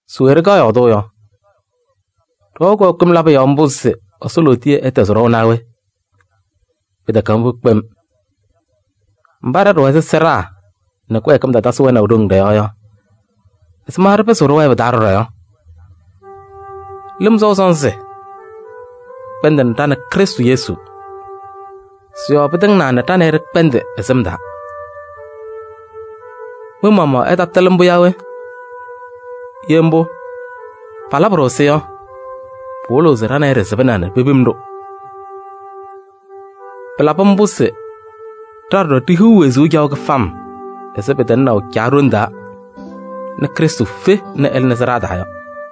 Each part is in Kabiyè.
Se we ɖɩkaɣ yɔɔdʋʋ yɔ? Ɖɩwɛɣ kɩwɛɛkɩm labʋ yɔɔ mbʋ se Ɛsɔ lootiye ɛtɛzɩ ɖɔʋ naa we? Pɩtɛkɛ mbʋ kpem! Mba ɖa ɖɩwɛ ɛzɩ sɩɖaa nɛ kɩwɛɛkɩm tatasɩ wɛnaʋ ɖoŋ ɖɔ-yɔɔ yɔ, ɛzɩma ɖɩpɩzɩɣ ɖɩwɛɛ pɩ-taa ɖɔɖɔ yɔ? Lɩm sɔʋ sɔnzɩ kpɛndɩnɩ ɖa nɛ Krɩstʋ Yesu. Sɩ-yɔɔ pɩtɩŋnaa nɛ ɖa nɛ ɩ ɖɩkpɛndɩ ɛ-sɩm taa. Mɩ-maɣmaɣ ɩtatɩlɩ mbʋ yaa we? Ye mbʋ, palabɩ-ɖʋ-sɩ yɔ, pɩwɩlɩɣ se ɖa nɛ ɩ ɖɩsɩbɩna nɛ pepim-ɖʋ. Pɩlabɩ mbʋ se ɖa ɖɔɖɔ ɖihiɣ wezuu caɣʋ kɩfam ɛzɩ pɩtɩŋnaʋ Caa ɖoŋ taa nɛ Krɩstʋ fe nɛ ɛlɩnɩ sɩɖaa taa yɔ.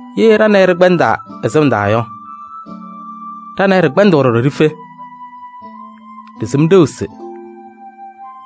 Ye ɖa nɛ ɩ ɖɩkpɛndɩ ɛ-sɩm taa yɔ, ɖa nɛ ɩ ɖɩkpɛndɩɣ ɖɔɖɔ ɖife. Ɖɩsɩm ɖeu se: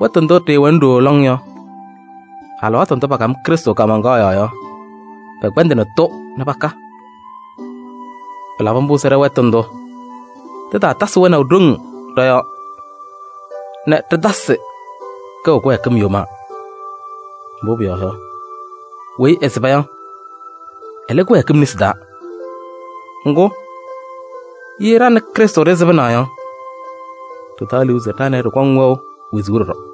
wɛtʋ ndʋ ɖɩɩwɛna ɖooo lɔŋ yɔ, alɩwaatʋ ndʋ pakam Krɩstʋ kaamaŋkaɣ yɔɔ yɔ, pɛkpɛndɩnɩ-tʋ nɛ paka. Pɩlabɩ mbʋ se ɖɛ-wɛtʋ ndʋ, tɩtaatasɩ wɛnaʋ ɖoŋ ɖɔ-yɔɔ nɛ ɖɩtasɩ kɛʋ kɩwɛɛkɩm yomaa. Mbʋ pʋyɔɔ yɔ, weyi ɛsɩba yɔ, ɛlɩ kɩwɛɛkɩm nesi taa. Ŋgʋ, ye ɖa nɛ Krɩstʋ ɖɩsɩbɩna yɔ, ɖɩtaɣ liu se ɖa nɛ ɩ ɖɩkɔŋ wɛʋ wezuu ɖɔɖɔ.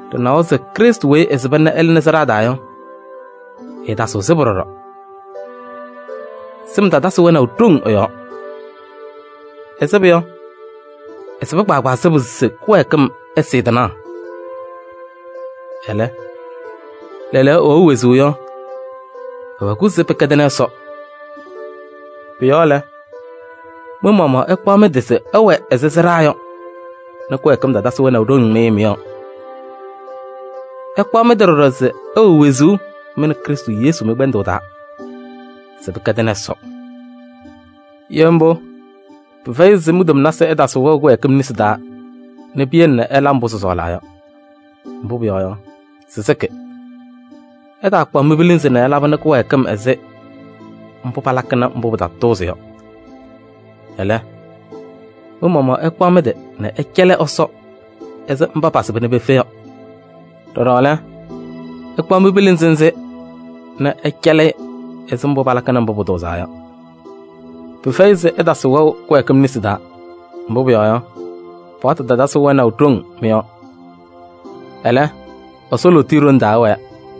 Ɖɩnawa se Krɩstʋ weyi ɛsɩba nɛ ɛlɩnɩ sɩɖaa taa yɔ, ɛɛtasɩɣ sɩbʋ ɖɔɖɔ. Sɩm tatasɩ wɛnaʋ ɖoŋ ɛ-yɔɔ. Ɛsɩbʋ yɔ, ɛsɩba kpaagbaa sɩbʋ se kɩwɛɛkɩm ɛsɩɩ tɩnaɣ. Ɛlɛ, lɛɛlɛɛyɔ ɛwɛʋ wezuu yɔ, ɛwɛ-kʋ se pɩkɛdɩnɩ Ɛsɔ. Pʋ-yɔɔ lɛ, mɩ-maɣmaɣ ɩkpaɣ mɩ-tɩ se ɩwɛ ɛzɩ sɩɖaa yɔ nɛ kɩwɛɛkɩm tatasɩ wɛnaʋ ɖoŋ mɩ-yɔɔ. Ɩkpaɣ mɩ-tɩ ɖɔɖɔ se ɩwɛ wezuu mɩ nɛ Krɩstʋ Yesu mɩ-kpɛndʋʋ taa se pɩkɛdɩnɩ Ɛsɔ. Ye mbʋ, pɩfɛyɩ se mi-tomnasɩ ɛtasɩ wɛʋ kɩwɛɛkɩm nesi taa nɛ piyele nɛ ɩla mbʋ sɩsɔɔlaa yɔ. Mbʋ pʋyɔɔ yɔ, sɩsɩkɩ. Ɩtaakpaɣ mi-pilinzi nɛ ɩlabɩnɩ kɩwɛɛkɩm ɛzɩ mbʋ palakɩnɩ mbʋ pɩtatʋʋzɩ yɔ. Ɛlɛ, mɩ-maɣmaɣ ɩkpaɣ mɩ-tɩ nɛ ɩcɛlɩ Ɛsɔ ɛzɩ mba pasɩba nɛ pefe yɔ. Ɖɔɖɔ lɛ, ɩkpaɣ mi-pilinzi nzɩ nɛ ɩcɛlɩ-ɩ ɛzɩ mbʋ palakɩnɩ mbʋ pʋtʋʋzaa yɔ. Pɩfɛyɩ se ɩtasɩ wɛʋ kɩwɛɛkɩm nesi taa, mbʋ pʋyɔɔ yɔ, paɣtʋ tatasɩ wɛnaʋ ɖoŋ mɩ-yɔɔ. Ɛlɛ, Ɛsɔ lootiye ɖoŋ taa ɩwɛɛ.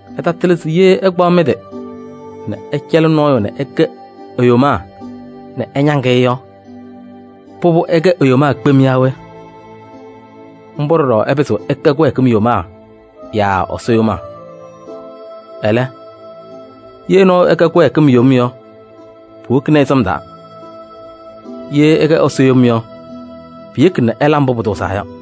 Ɩtatɩlɩ se ye ɩkpaɣ mɩ-tɩ nɛ ɩcɛlɩ nɔɔyʋ nɛ ɩkɛ e-yomaa nɛ ɩñaŋ-ɩ yɔ, pʋbʋ, ɩkɛ e-yomaa kpem yaa we? Mbʋ ɖɔɖɔ ɩpɩzɩɣ ɩkɛ kɩwɛɛkɩm yomaa yaa Ɛsɔ yomaa. Ɛlɛ, ye ɛyʋ ɛkɛ kɩwɛɛkɩm yom yɔ, puwokini-i sɩm taa. Ye ɛkɛ Ɛsɔ yom yɔ, piyeki nɛ ɛla mbʋ pʋtʋʋzaa yɔ.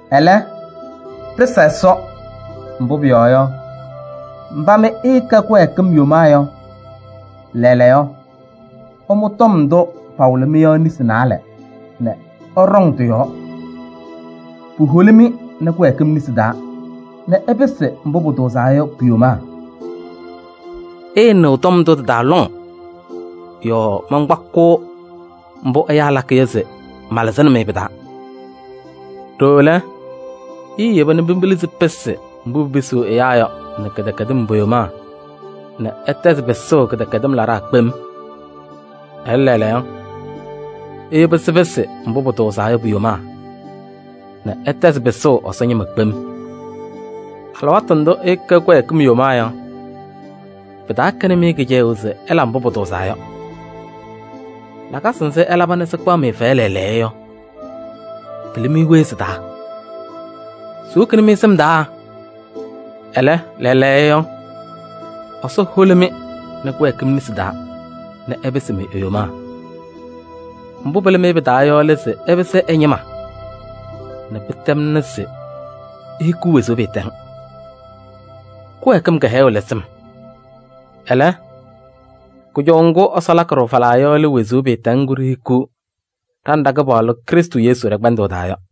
Ɛlɛ, ɖɩsa Ɛsɔ. Mbʋ pʋyɔɔ yɔ, mba mɩ ɩɩkɛ kɩwɛɛkɩm yomaa yɔ, lɛɛlɛɛyɔ, ɩmʋ tɔm ndʋ pawɩlɩ-mɩ yɔ nesi naalɛ nɛ ɩɖɔŋ tɩ-yɔɔ. Puholi-mɩ nɛ kɩwɛɛkɩm nesi taa nɛ ɩpɩsɩ mbʋ pʋtʋʋzaa yɔ pu-yomaa. Ɩɩnɩɣ tɔm taa lɔŋ yɔɔ mankpakɩɣ mbʋ ɛyaa lakɩ yɔ se malɩzɩnɩ-mɩ pɩ-taa. Ɖooo lɛ, iiyeba nɛ mi-pilinzi pɩsɩ mbʋ pipisiɣ ɛyaa yɔ nɛ kɩdɛkɛdɩm po-yomaa nɛ ɩtɛzɩ pɩsʋʋ kɩdɛkɛdɩm laɖaa kpem. Ɛlɛ, lɛɛlɛɛyɔ, iyebi sɩpɩsɩ mbʋ pʋtʋʋzaa yɔ pu-yomaa nɛ ɩtɛzɩ pɩsʋʋ Ɛsɔ ñɩma kpem. Alɩwaatʋ ndʋ ɩɩkɛ kɩwɛɛkɩm yomaa yɔ, pɩtaakɛnɩ-mɩ kɩcɛyʋʋ se ɩla mbʋ pʋtʋʋzaa yɔ. Lakasɩ nzɩ ɩlaba nɛ sɩkpaɣ-mɩ fɛyɛ lɛɛlɛɛyɔ yɔ, pɩlɩ-mɩ we sɩ-taa? Siwokini-mɩ sɩm taa! Ɛlɛ, lɛɛlɛɛyɔ, Ɛsɔ holi-mɩ nɛ kɩwɛɛkɩm nesi taa nɛ ɩpɩsɩ e-yomaa. Mbʋ pɩlɩ-mɩ pɩ-taa yɔ lɛ se ɩpɩsɩ ɛ-ñɩma nɛ pɩtɛmna se ihikiɣ wezuu pɩɩtɛŋ. Kɩwɛɛkɩm kɩhɛyʋʋ lɛ sɩm. Ɛlɛ, kʋjɔʋ ŋgʋ Ɛsɔ lakɩ-ɖʋ falaa yɔ lɛ wezuu pɩɩtɛŋ ŋgʋ ɖihiɣ ɖa nɛ ɖa-Kɩpaɣlʋ Krɩstʋ Yesu ɖɛ-kpɛndʋʋ taa yɔ.